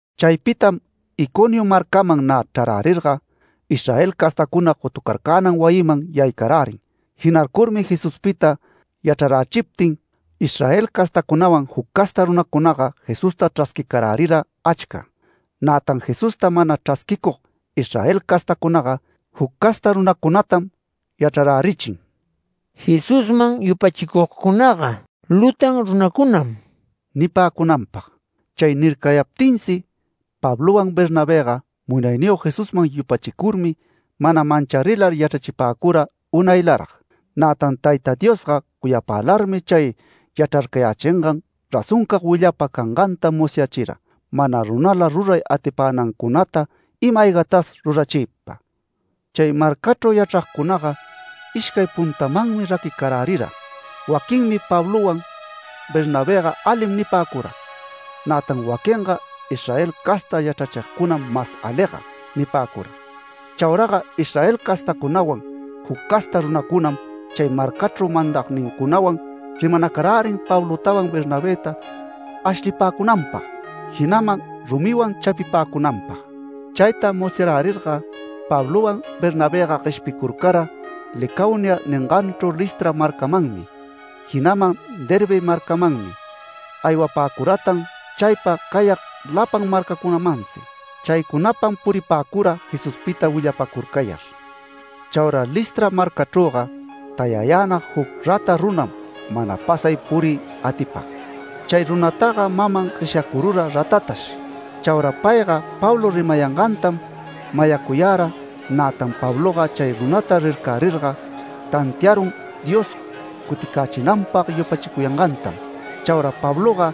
Chaypitam Iconio marcaman nä chrarärirga, Israel castacuna gotucarcänan wayiman yaycarärin. Jinarcurmi Jesuspita yachrarärichiptin, Israel castacunawan juc casta runacunaga Jesusta chrasquicarärira achca. Nätan Jesusta mana chrasquicug Israel castacunaga, juc casta runacunatam yachrarärichin: “Jesusman yupachicugcunaga lutan runacunam” nipäcunanpag. Chay nircayaptinsi Pablowan Bernabëga Munayniyog Jesusman yupachicurmi mana mancharilar yachrachipäcura unaylarag. Nätan Tayta Diosga cuyapälarmi chay yachrarcayächingan razoncag willapa canganta musyachira, mana runala ruray atipänancunata ima-aygatas rurachiypa. Chay marcachru yachragcunaga ishcay puntamanmi raquicarärira. Waquinmi “Pablowan Bernabëga alim” nipäcura. Nätan waquinga “Israel casta yachrachigcunam mas aliga” nipäcura. Chauraga Israel castacunawan juc casta runacunam chay marcachru mandagnincunawan rimanacarärin Pablotawan Bernabëta ashlipäcunanpag, jinaman rumiwan chapipäcunanpag. Chayta musyarärirga Pablowan Bernabëga gueshpicurcara Licaonia ninganchru Listra marcamanmi, jinaman Derbe marcamanmi. Aywapäcuratan chaypa cayag lapan marcacunamansi. Chaycunapam puripäcura Jesuspita willapacurcayar. Chaura Listra marcachrüga tayayänag juc rata runam mana pasay puriy atipag. Chay runataga maman gueshyacurura ratatash. Chaura payga Pablo rimayangantam mayacuyara, nätan Pabloga chay runata rircärirga tantiarun Dios cuticächinanpag yupachicuyangantam. Chaura Pabloga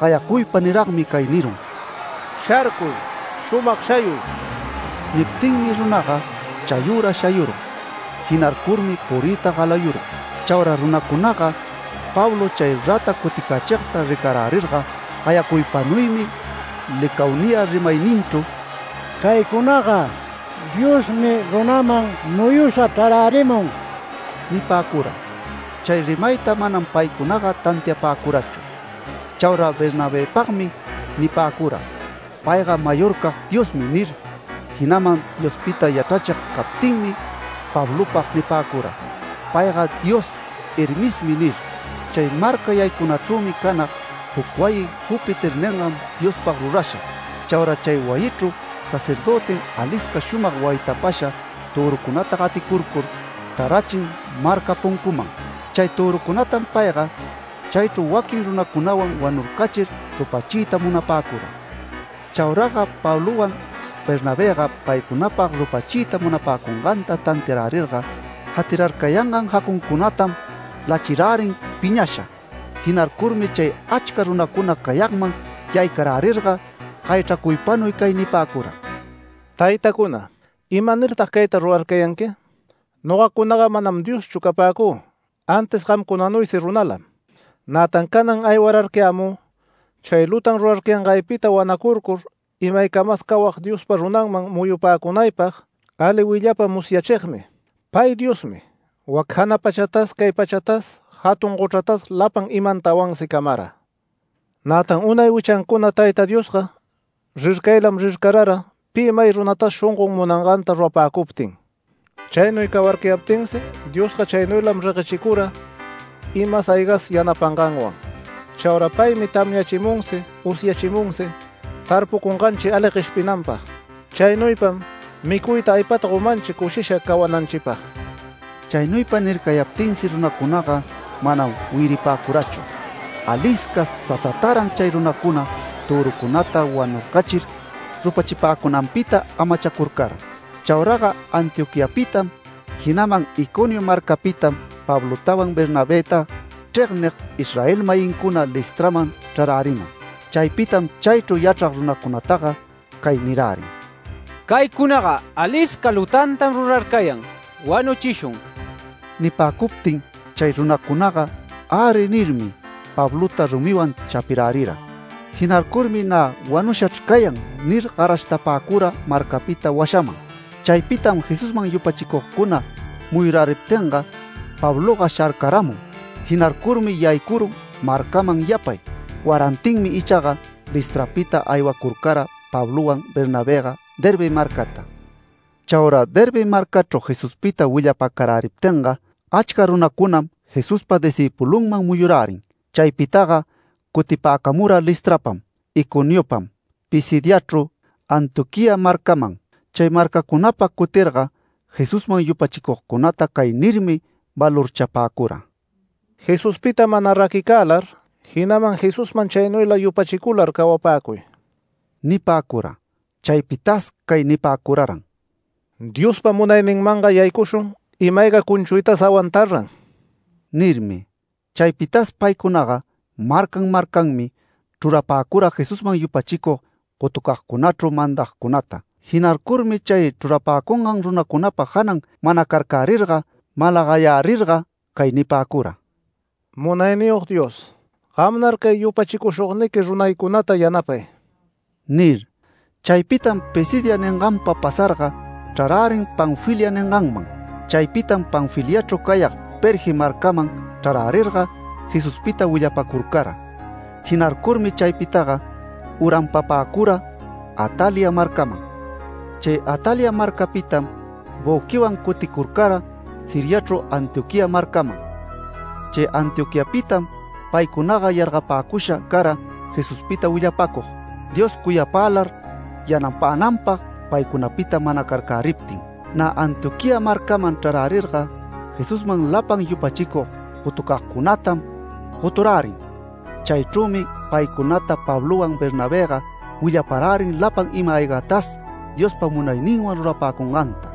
gayacuypa niragmi cay nirun: “¡Sharcuy. Shumag shayuy!” Niptinmi runaga chayüra shayurun. Jinarcurmi puriyta galayurun. Chaura runacunaga Pablo chay rata cuticächigta ricarärirga, gayacuypanuymi Licaonia rimayninchru: “¡Caycunaga diosmi runaman muyusha chrarärimun!” nipäcura. Chay rimayta manam paycunaga tantiapäcurachu. Chaura Bernabëpagmi nipäcura: “Payga mayorcag diosmi” nir, jinaman Diospita yachrachig captinmi Pablopag nipäcura: “Payga dios Hermesmi” nir. Chay marca yaycunachrümi canag juc wayi Júpiter ningan diospag rurasha. Chaura chay wayichru sacerdötim alisca shumag waytapasha törucunata gaticurcur chrarachin marca puncuman. Chay törucunatam payga chaychru waquin runacunawan wanurcachir rupachiyta munapäcura. Chauraga Pablowan Bernabëga paycunapag rupachiyta munapäcunganta tantiarärirga jatirarcayangan jacuncunatam lachirärin piñasha. Jinarcurmi chay achca runacuna cayagman yaycarärirga gayachracuypanuy cay nipäcura: “Taytacuna, ¿imanirtag cayta rurarcayanqui? Nogacunaga manam dioschu capäcü antis gamcunanuysi runalam. Nätan canan aywararcayämü chay lutan rurarcayangaypita wanacurcur imaycamas cawag Diospa runanman muyupäcunaypag, ali willapa musyachigmi. Pay Diosmi wac jana pachatas cay pachatas jatun gochratas lapan imantawansi camara. Nätan unay wichancuna Tayta Diosga rircaylam rircarara pi may runatas shongon munanganta rurapäcuptin. Chaynuy cawarcayaptinsi Diosga chaynuylam reguechicura, imas aygas yanapanganwan. Chaura paymi tamyachimunsi usyachimunsi tarpucunganchi ali gueshpinanpag. Chaynuypam micuyta aypata gomanchi cushisha cawananchipag”. Chaynuypa nircayaptinsi runacunaga manam wiyaripäcurachu. Alisca sasataran chay runacuna törucunata wanurcachir rupachipäcunanpita amachacurcara. Chauraga Antioquiapitam, jinaman Iconio marcapitam Pablotawan Bernabëta chregnig Israel-mayincuna Listraman chrarärimun. Chaypitam chaychru yachrag runacunataga cay nirärin: “Caycunaga alisca lutantam rurarcayan. Wanuchishun”. Nipäcuptin chay runacunaga “Äri” nirmi, Pablota rumiwan chapirärira. Jinarcurmi “Nä wanushachr cayan” nir garashtapäcura marcapita washaman. Chaypitam Jesusman yupachicugcuna muyuräriptinga Pabloga sharcaramun. Jinarcurmi yaycurun marcaman yapay. Warantinmi ichaga Listrapita aywacurcara Pablowan Bernabëga Derbe marcata. Chaura Derbe marcachru Jesuspita willapacaräriptinga, achca runacunam Jesuspa discïpulunman muyurärin. Chaypitaga cutipäcamura Listrapam, Iconiopam, Pisidiachru Antioquía marcaman. Chay marcacunapa cutirga Jesusman yupachicugcunata cay nirmi valorchapäcura: “Jesuspita mana raquicälar, jinaman Jesusman chaynuyla yupachicular cawapäcuy” nipäcura. Chaypitas cay nipäcuraran: “Diospa munayninmanga yaycushun ima-ayga cunchuytas awantar-ran” nirmi. Chaypitas paycunaga marcan marcanmi chrurapäcura Jesusman yupachicug gotucagcunachru mandagcunata. Jinarcurmi chay chrurapäcungan runacunapa janan manacarcärirga malagayärirga, cay nipäcura: “Munayniyog Dios, gamnar cay yupachicushugniqui runaycunata yanapay” nir. Chaypitam Pisidia ninganpa pasarga chrarärin Panfilia ninganman. Chaypitam Panfiliachru cayag Perge marcaman chrarärirga Jesuspita willapacurcara. Jinarcurmi chaypitaga uranpapäcura Atalia marcaman. Chay Atalia marcapitam büquiwan cuticurcara Siriachru Antioquía marcaman. Chay Antioquiapitam paycunaga yargapäcusha cara Jesuspita willapäcug, Dios cuyapälar yanapänanpag paycunapita manacarcäriptin. Nä Antioquía marcaman chrarärirga, Jesusman lapan yupachicug gotucagcunatam goturärin. Chaychrümi paycunata Pablowan Bernabëga willaparärin lapan ima-aygatas Diospa munayninwan rurapäcunganta,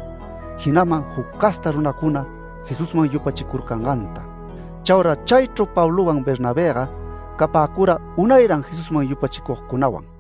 jinaman juc casta runacuna Jesusman yupachicurcanganta. Chaura chaychru, Pablowan Bernabëga capäcura unayran Jesusman yupachicugcunawan.